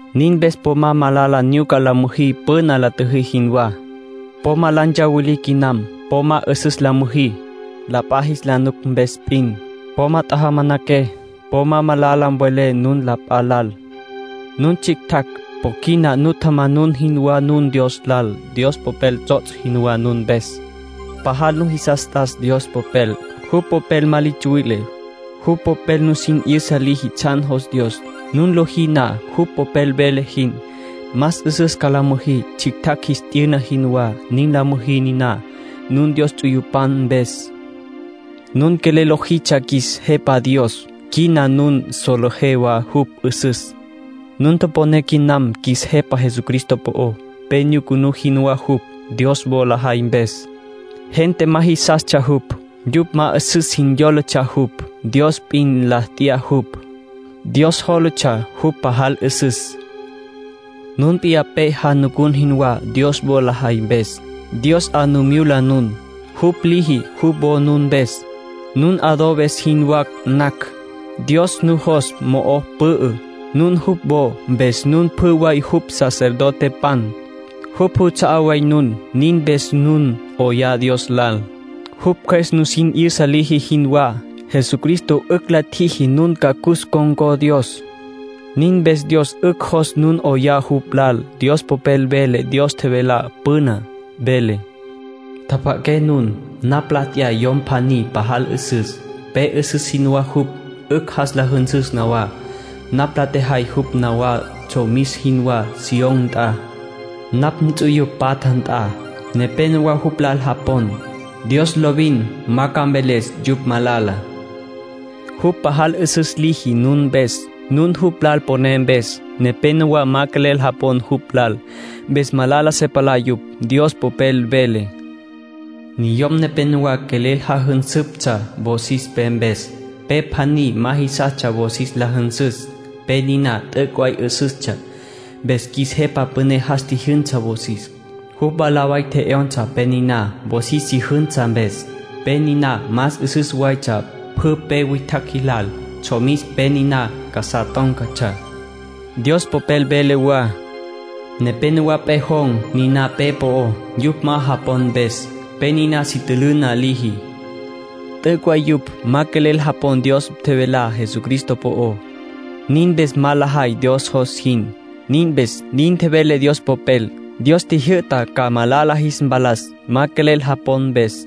Nin mpes po ma malala nyuca la müjí püna la tjüjí jinwá. Po ma la ntsawilí quinam. Po ma 'üsüs la müjí, la p'a jis la nuc mpes p'in. Po ma tjajamanaqué. Po ma malala mvelé nun la p'a lal. Nun tsjictjacj; po quina nu tjamanun jinwá nun Dios lal. Dios Popel tsots' jinwá nun mpes. Pajal nujisas t'as Dios Popel. Jupj Popel ma li tsuwile. Jupj Popel nusin 'yüsa liji tsjan jos Dios. Nun lojí na jupj Popel vele jin, más 'üsüs ca la müjí, tsjictjacj jis t'yüna jinwá. Nin la müjí niná, nun Dios ts'uyupan mpes. Nun quelel lojitsja qjuis Jepa Dios; quina nun solejé wa jupj 'üsüs. Nun toponé quinam qjuis Jepa Jesucristo po'ó. Pe nyucunú jinwá jupj, Dios wo lajay mpes. Gente ma jisastsja jupj. Yupj ma 'üsüs jin yólatsja jupj. Dios p'in la t'ya jupj. Dios jólatsja jupj pajal 'üsüs. Nun p'iyá pe janucun jinwá, Dios wo lajay mpes. Dios 'a nu myula nun, jupj liji jupj wo nun mpes, nun adobes jinwá nacj. Dios nujos mo'o pü'ü. Nun jupj wo, mpes nun pjü way jupj sacerdotepan. Jupj juts'a'á way nun. Nin mpes nun 'oyá Dios lal, jupj Cjües nusin 'yüsa liji jinwá. Jesucristo 'ücj la tjiji nun ca cus ncon̈có Dios. Nin mpes Dios 'ücj jos nun 'oyá jupj lal. Dios Popel vele Dios tjevelá püná. Vele: “Tjapja'aqué nun. Napj la t'ya yom pjaní pajal 'üsüs. Pe 'üsüs jinwá jupj 'ücj jas la jünsüs nawá. Napj la tjejay jupj nawá tsjomis jinwá Sión nt'a, napj nts'uyupj patja nt'a. Nepénowa jupj lal japon. Dios lovin ma ca mveles yupj malala.” Jupj pajal 'üsüs liji nun mpes, nun jupj lal poné mpes. Nepénowa ma quelel japon jupj lal, mpes malala se palá yupj. Dios Popel vele: “Niyom nepénowa quelel jajünsüptsja wosis pe mpes. Pe pjaní ma jisastsja wosis la jünsüs. Pe niná t'üc' way 'üsüstsja. Mpes qjuis Jepa Püné jas tjijyünsa wosis. Jupj mwalá way tje'yonsa pe niná wosis si jünsa mpes. Pe niná más 'üsüs waytsja pjü pe witjacj jilal. Tsjomis pe niná casá tón̈catsja.” Dios Popel vele wa: “Nepénowa pejon̈ niná pe po'ó, yupj ma japon mpes. Pe niná si tülüna liji.” T'üc' way yupj ma quelel japon Dios tjevelá Jesucristo po'ó. Nin mpes ma lajay Dios jos jin. Nin mpes nin tjevele Dios Popel. Dios tjijyü'ta ca malala jis mpalas, ma quelel japon mpes.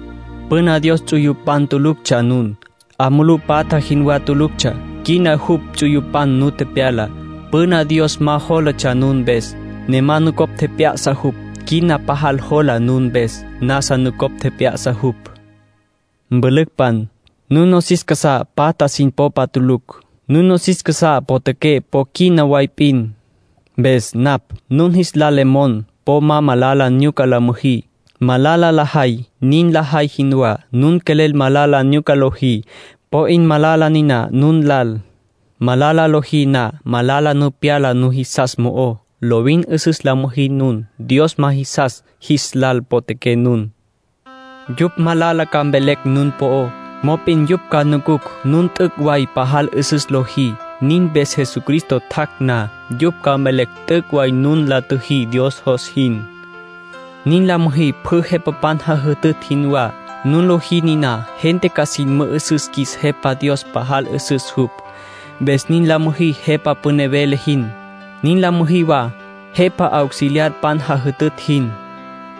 Püna Dios ts'uyupan tuluctsja nun. 'A mulú patja jinwá tuluctsja. Quina jupj ts'uyupan nu tepyala. Püna Dios ma jólatsja nun mpes, ne ma nucopj tjep'ya'sa jupj. Quina pajal jola nun mpes; nasa nucopj tjep'ya'sa jupj. Mpülücpan, nun nosis casá patja sin popa tulucj. Nun nosis casá potjaqué po quina way p'in. Mpes, napj nun jis lal le mon po ma malala nyuca la müjí, malala lajay nin lajay jinwá. Nun quelel malala nyuca lojí, po 'in malala niná nun lal. Malala lojí na, malala nu pyala nujisas mo'ó. Lovin 'üsüs la müjí nun. Dios ma jisas jis lal potjaqué nun. Yupj malala ca mvelecj nun po'ó, mop'in yupj ca nucucj nun t'üc' way pajal 'üsüs lojí. Nin mpes Jesucristo tjac' na, yupj ca mvelecj t'üc' way nun la tjüjí Dios jos jin. Nin la müjí pjü jepapan jajütütj jinwá. Nun lojí niná, gente ca sin mü'üsüs qjuis Jepa Dios pajal 'üsüs jupj. Mpes nin la müjí jepa püné vele jin. Nin la müjí wa jepa auxiliarpan jajütütj jin.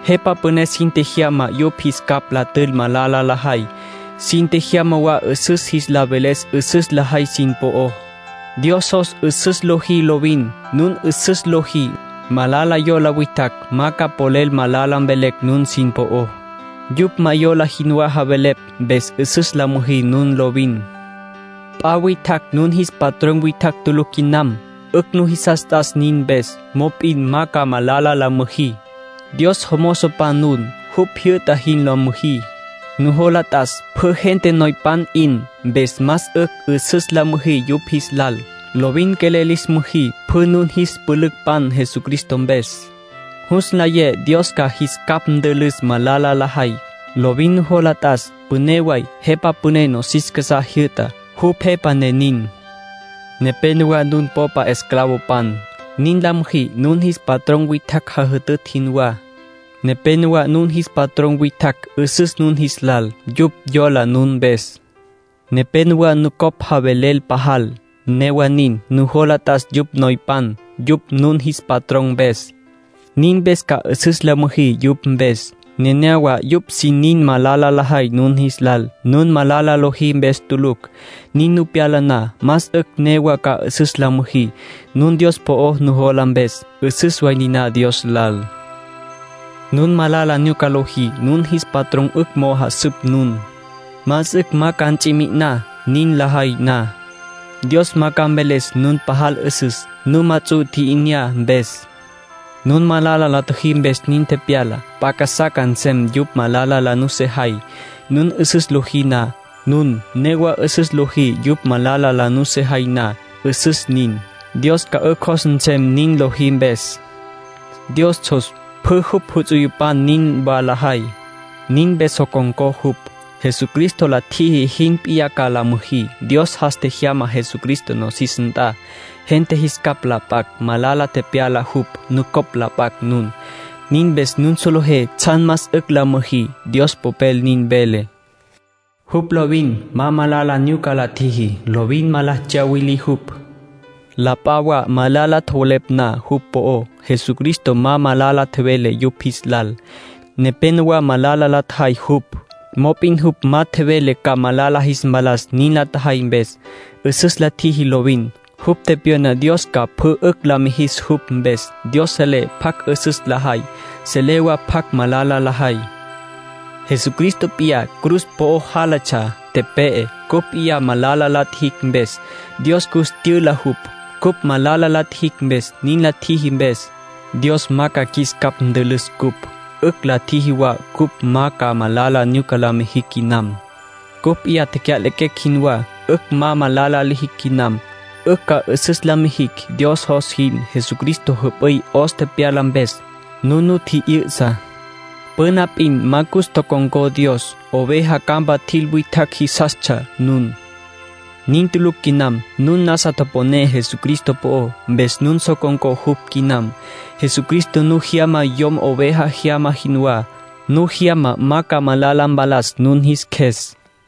Jepa püné sin tjejyama yupj jis capj la tül malala lajay. Sin tjejyama wa 'üsüs jis la veles 'üsüs lajay sin po'ó. Dios jos 'üsüs lojí lovin. Nun 'üsüs lojí, malala yola witjacj ma ca polel malala mvelecj nun sin po'ó. Yupj ma yola jinwá javelepj. Mpes 'üsüs la müjí nun lovin. P'a witjacj nun jis patrón witjacj tulucj quinam. 'Ücj nujisas t'as nin mpes. Mop'in ma ca malala la müjí. Dios jomozopan nun. Jupj jyü'ta jin la müjí. Nujola t'as pjü gente noypan 'in, mpes más 'ücj 'üsüs la müjí yupj jis lal. Lovin quelel lis müjí pjü nun jis pülücpan Jesucristo mpes. Jus nlayé Dios ca jis capj ntülüs malala lajay. Lovin nujola t'as püné way jepa püné nosis casá jyü'tá, jupj jepa ne nin. Nepénowa nun popa esclavopan. Nin la müjí nun jis patrón witjacj jajütütj jinwá. Nepénowa nun jis patrón witjacj 'üsüs nun jis lal; yupj yola nun mpes. Nepénowa nucopj javelel pajal. Newa nin, nujola t'as yupj noypan, yupj nun jis patrón mpes. Nin mpes ca 'üsüs la müjí yupj mpes. Nenéyawa yupj sin nin malala lajay nun jis lal, nun malala lojí mpes tulucj. Nin nu pyala na, más 'ücj newa ca 'üsüs la müjí, nun Dios po'o nujola mpes. 'Üsüs way niná Dios lal. Nun malala nyuca lojí, nun jis patrón 'ücj mo'o jasüp nun. Más 'ücj ma ca ts'i mi'iná nin lajay na. Dios ma ca mveles nun pajal 'üsüs, nun ma ts'u tji'inyá mpes. Nun malala la tjüjí mpes nin tepyala. P'a casá ca nsem yupj malala la nusejay, nun 'üsüs lojí na. Nun newa 'üsüs lojí yupj malala la nusejay na, 'üsüs nin. Dios ca 'ücj jos nsem nin lojí mpes. Dios jos pjü jupj ts'uyupan nin wa lajay. Nin mpes so con̈có jupj. Jesucristo la tjiji jin p'iyá ca la müjí. Dios jas tjejyama Jesucristo nosis nt'a, gente jis capj la p'acj. Malala tepyala jupj, nucopj la p'acj nun. Nin mpes nun solejé tsjan más 'ücj la müjí. Dios Popel nin vele: “Jupj lovin ma malala nyuca la tjiji. Lovin ma la tsyawilí jupj.” La p'a wa malala tjowelepj na jupj po'ó, Jesucristo ma malala tjevele yupj jis lal. Nepénowa malala la tjajay jupj, mop'in jupj ma tjevele ca malala jis mpalas nin la tjajay mpes. 'Üsüs la tjiji lovin. Jupj tepyona Dios ca pjü 'ücj la mijis jupj mpes. Dios selé pjacj 'üsüs lajay, selé wa pjacj malala lajay. Jesucristo p'iyá cruz po'o jálatsja, tepe'e, cupj p'iyá malala la tjijicj mpes. Dios cus tyüla jupj, cupj malala la tjijicj mpes. Nin la tjiji mpes, Dios ma ca qjuis capj ntülüs ncupj. 'Ücj la tjiji wa cupj ma ca malala nyuca la mijicj quinam. Cupj p'iyá tecya'lequecj jinwá, 'ücj ma malala lijicj quinam. 'Ücj ca 'üsüs la mijicj, Dios jos jin. Jesucristo jüp'üy 'os tepyala mpes, nun nu tji'yü'sa. Püna p'in ma cus tocon̈có Dios. Oveja campa tjil witjacj jinwatsja nun. Nin tulucj quinam. Nun nasa toponé Jesucristo po'ó, mpes nun so con̈có jupj quinam. Jesucristo nu jyama yom oveja jyama jinwá. Nu jyama ma ca malala mpalas nun jis qjues.